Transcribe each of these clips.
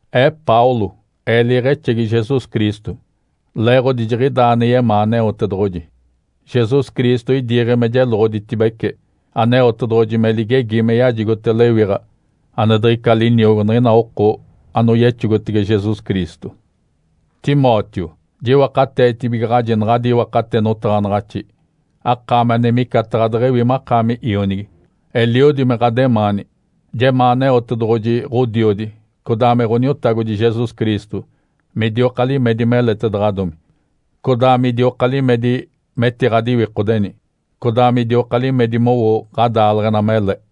Ee Paulo, ee liiɡ̶exegi Jesus Cristo, leeɡ̶odi jiɡ̶idaa ane yemaa Aneotedoɡ̶oji. Jesus Cristo idiiɡ̶e me jeloɡ̶oditibece Aneotedoɡ̶oji me ligegi me yajigote lewiɡ̶a ane diɡ̶ica liniogo niɡ̶ina oko anoyexogotege Jesus Cristo. Timóteo, jiwakateetibigaɡ̶aji naɡ̶adi iwakate notaɡ̶anaɡ̶axi, akaami ane micataɡ̶a deɡ̶ewi makaami ionigi, eliodi me ɡ̶ademaani. Jemaa Aneotedoɡ̶oji Ǥodiodi, codaa me Ǥoniotagodi Jesus Cristo midioka limedi meletaɡ̶adomi, codaa midioka limedi metiɡ̶adiwikodeni, codaa midioka limedi mowo ɡ̶adaaleɡ̶ena mele.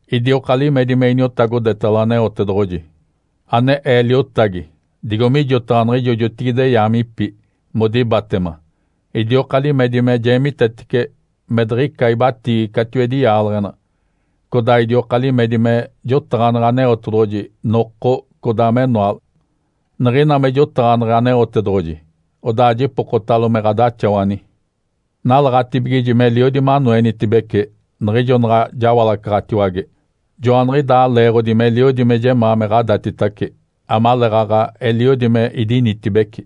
Idioka limedi me iniotagodetalo Aneotedoɡ̶oji, ane ee liotagi digo mijotaɡ̶a niɡ̶ijo jotigide yaamipi modibatema, idioka limedi me jeemitetece me diɡ̶ica ibatiigi catiwedi yaaleɡ̶ena. Codaa idioka limedi me jotaɡ̶aneɡ̶e Aneotedoɡ̶oji noko, codaa menoale. Niɡ̶ina me jotaɡ̶aneɡ̶e Aneotedoɡ̶oji, odaa jipokotalo me ɡ̶adaxawani. Nalaɡ̶atibigiji meliodi manoenitibece niɡ̶ijo naɡ̶a jawalacaɡ̶atiwage. Joaniɡ̶idaa leeɡ̶odi meliodi me jemaa me ɡ̶adatitace, amaleeɡ̶aɡ̶a eliodi me idinitibeci.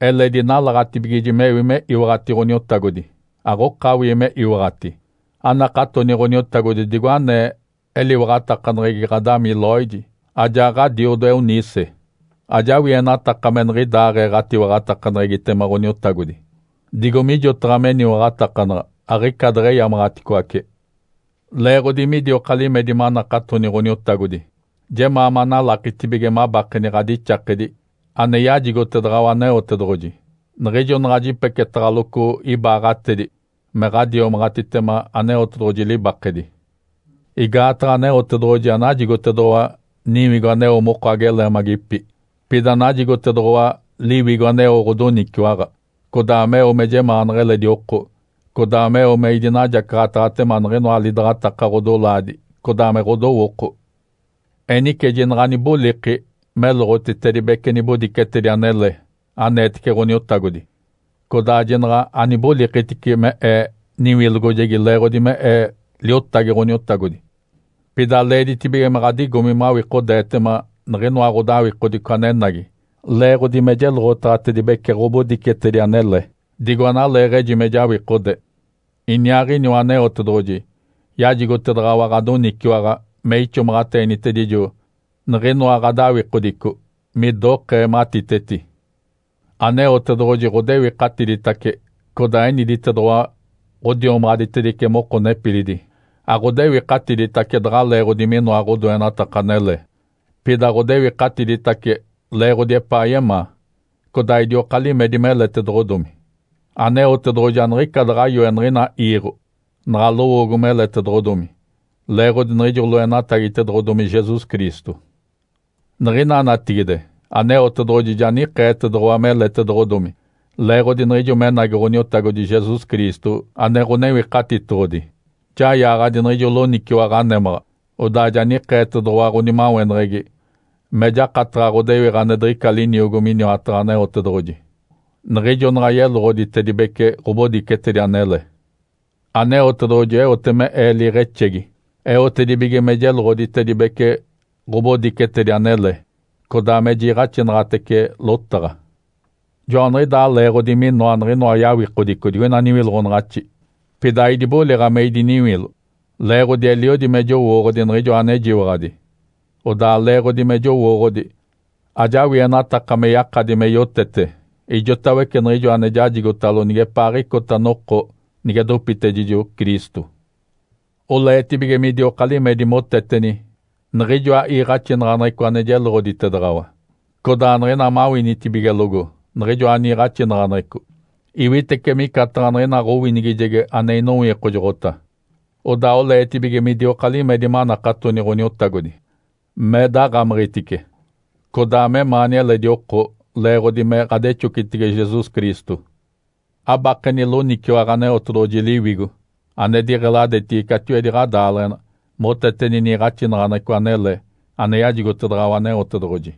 Eledi nalaɡ̶atibigiji mewi me iwaɡ̶ati Ǥoniotagodi, aɡ̶okawii me iwaɡ̶ati. Anakatoni Ǥoniotagodi digo anee eliwaɡ̶atakaneɡ̶egi ɡ̶adami Lóide, ajaa ɡ̶adiodo Eunice. Ajawienataka me niɡ̶idaaɡ̶ee ɡ̶atiwaɡ̶atakaneɡ̶egitema Ǥoniotagodi, digo mijotaɡ̶a meniwaɡ̶atakanaɡ̶a aɡ̶ica deɡ̶eyamaɡ̶aticoace. Leeɡ̶odi midioka limedi manakatoni Ǥoniotagodi, jemaa manalakitibige mabakeni ɡ̶adixakedi ane yajigotedaɡ̶awa Aneotedoɡ̶oji niɡ̶ijo naɡ̶a jipeketaɡ̶aloco ibaaɡ̶atedi me ɡ̶adiomaɡ̶atitema Aneotedoɡ̶oji libakedi. Igaataɡ̶a Aneotedoɡ̶oji anajigotedoɡ̶owa niwigo aneo moko ageleemagipi, pida najigotedoɡ̶owa Liwigo aneo ɡ̶odoniciwaɡ̶a, codaa meo me jemaanaɡ̶a eledi oko, codaa meo me idinajacaɡ̶ataɡ̶atema niɡ̶inoa lidaɡ̶ataka ɡ̶odolaadi codaa me ɡ̶odowooko. Enice jinaɡ̶a aniboliki meloɡ̶otitedibece nibodicetedi anele aneetece Ǥoniotagodi, codaa jinaɡ̶a anibolikitici me ee niwilogojegi leeɡ̶odi me ee liotagi Ǥoniotagodi. Pida leeditibige me ɡ̶adigomi mawikodeetema niɡ̶inoa ɡ̶odawikodico anenagi leeɡ̶odi me jeloɡ̶otaɡ̶atedibece ɡ̶obodicetedi anele, digo analeeɡ̶eji me jawikode. Iniaaɡ̶iniwa Aneotedoɡ̶oji yajigotedaɡ̶awa ɡ̶adoniciwaɡ̶a me ixomaɡ̶ateenitedijo niɡ̶inoa ɡ̶adawikodico midokee matiteti. Aneotedoɡ̶oji ɡ̶odewikatiditace, codaa eniditedoɡ̶owa ɡ̶odiomaɡ̶aditedice moko nepilidi. Aɡ̶odewikatiditace daɡ̶a leeɡ̶odi minoa ɡ̶odoenataka anele, pida ɡ̶odewikatiditace leeɡ̶odi epaa yemaa, codaa idioka limedi meletedoɡ̶odomi. Aneotedoɡ̶oji aniɡ̶ica daɡ̶a yoe niɡ̶ina iiɡ̶o naɡ̶a lowoogo meletedoɡ̶odomi leeɡ̶odi niɡ̶ijo loenatagitedoɡ̶odomi Jesus Cristo. Niɡ̶ina natigide, Aneotedoɡ̶oji ja nikeetedoɡ̶owa meletedoɡ̶odomi leeɡ̶odi niɡ̶ijo menagi Ǥoniotagodi Jesus Cristo ane Ǥonewikatitoɡ̶odi. Ja yaaɡ̶adi niɡ̶ijo loniciwaɡ̶a némaɡ̶a, odaa ja nikeetedoɡ̶owa ɡ̶onimaweneɡ̶egi me jakataɡ̶a ɡ̶odewiɡ̶a ane diɡ̶ica liniogo miniwataɡ̶a Aneotedoɡ̶oji, niɡ̶ijo naɡ̶a yeloɡ̶oditedibece ɡ̶obodicetedi anele. Aneotedoɡ̶oji eote me ee liiɡ̶exegi, eotedibige me jeloɡ̶oditedibece ɡ̶obodicetedi anele, codaa me jiiɡ̶axinaɡ̶atece lotaɡ̶a. Joaniɡ̶idaa leeɡ̶odi minoa niɡ̶inoa yawikodico digoina niwiloɡ̶onaɡ̶axi, pida aidiboliɡ̶a me idiniwilo. Leeɡ̶odi eliodi me jowooɡ̶odi Niɡ̶ijoa anejiwaɡ̶adi, odaa leeɡ̶odi me jowooɡ̶odi, ajawienataka me yakadi me yotete ijotawece niɡ̶ijo ane jajigotalo nigepaaɡ̶icota noko nige dopitedijo Cristo. Oleetibige midioka limedi moteteni niɡ̶ijoa iiɡ̶axinaɡ̶aneɡ̶eco ane jeloɡ̶oditedaɡ̶awa, codaa niɡ̶ina mawinitibigelogo niɡ̶ijoa niiɡ̶axinaɡ̶aneɡ̶eco, iwitece micataɡ̶a niɡ̶ina ɡ̶owinigijegi ane inowikojoɡ̶ota. Odaa oleetibige midioka limedi manakatoni Ǥoniotagodi, me daɡ̶amiɡ̶itice, codaa memaani eledi oko leeɡ̶odi me ɡ̶adexocitege Jesus Cristo. Abakeni loniciwaɡ̶a Aneotedoɡ̶oji Liwigo ane diɡ̶eladetigi catiwedi ɡ̶adaaleɡ̶ena moteteni niiɡ̶axinaɡ̶aneɡ̶eco anele ane yajigotedaɡ̶awa Aneotedoɡ̶oji.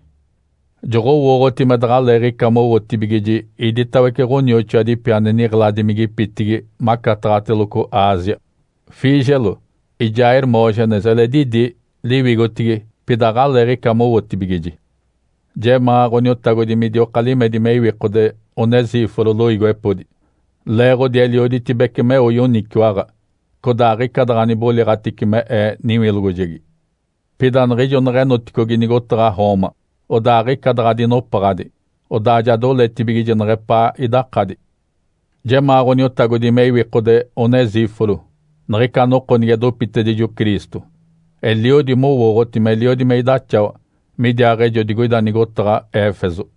Joɡ̶owooɡ̶oti me daɡ̶aleeɡ̶ica mowootibigiji iditawece ɡ̶onioxoadipi ane niɡ̶eladimigipitigi macataɡ̶ateloco Ásia. Fígelo ijaa Hermógenes eledi idi liwigotigi pida aɡ̶aleeɡ̶aɡ̶ica mowotibigiji. Jemaa Ǥoniotagodi midioka limedi me iwikode Onesíforo loiigiwepodi, leeɡ̶odi elioditibece meo yoniciwaɡ̶a, codaa aɡ̶ica daɡ̶a niboliɡ̶atici me ee niwilogojegi. Pida niɡ̶ijo neɡ̶enoticogi nigotaɡ̶a Roma, odaa aɡ̶ica daɡ̶a dinopaɡ̶adi, odaa ja doletibigiji neɡ̶epaa idakadi. Jemaa Ǥoniotagodi me iwikode Onesíforo niɡ̶ica noko nige dopitedijo Cristo. Eliodi mowooɡ̶oti meliodi me idaxawa midiaaɡ̶ejo digoida nigotaɡ̶a Éfeso.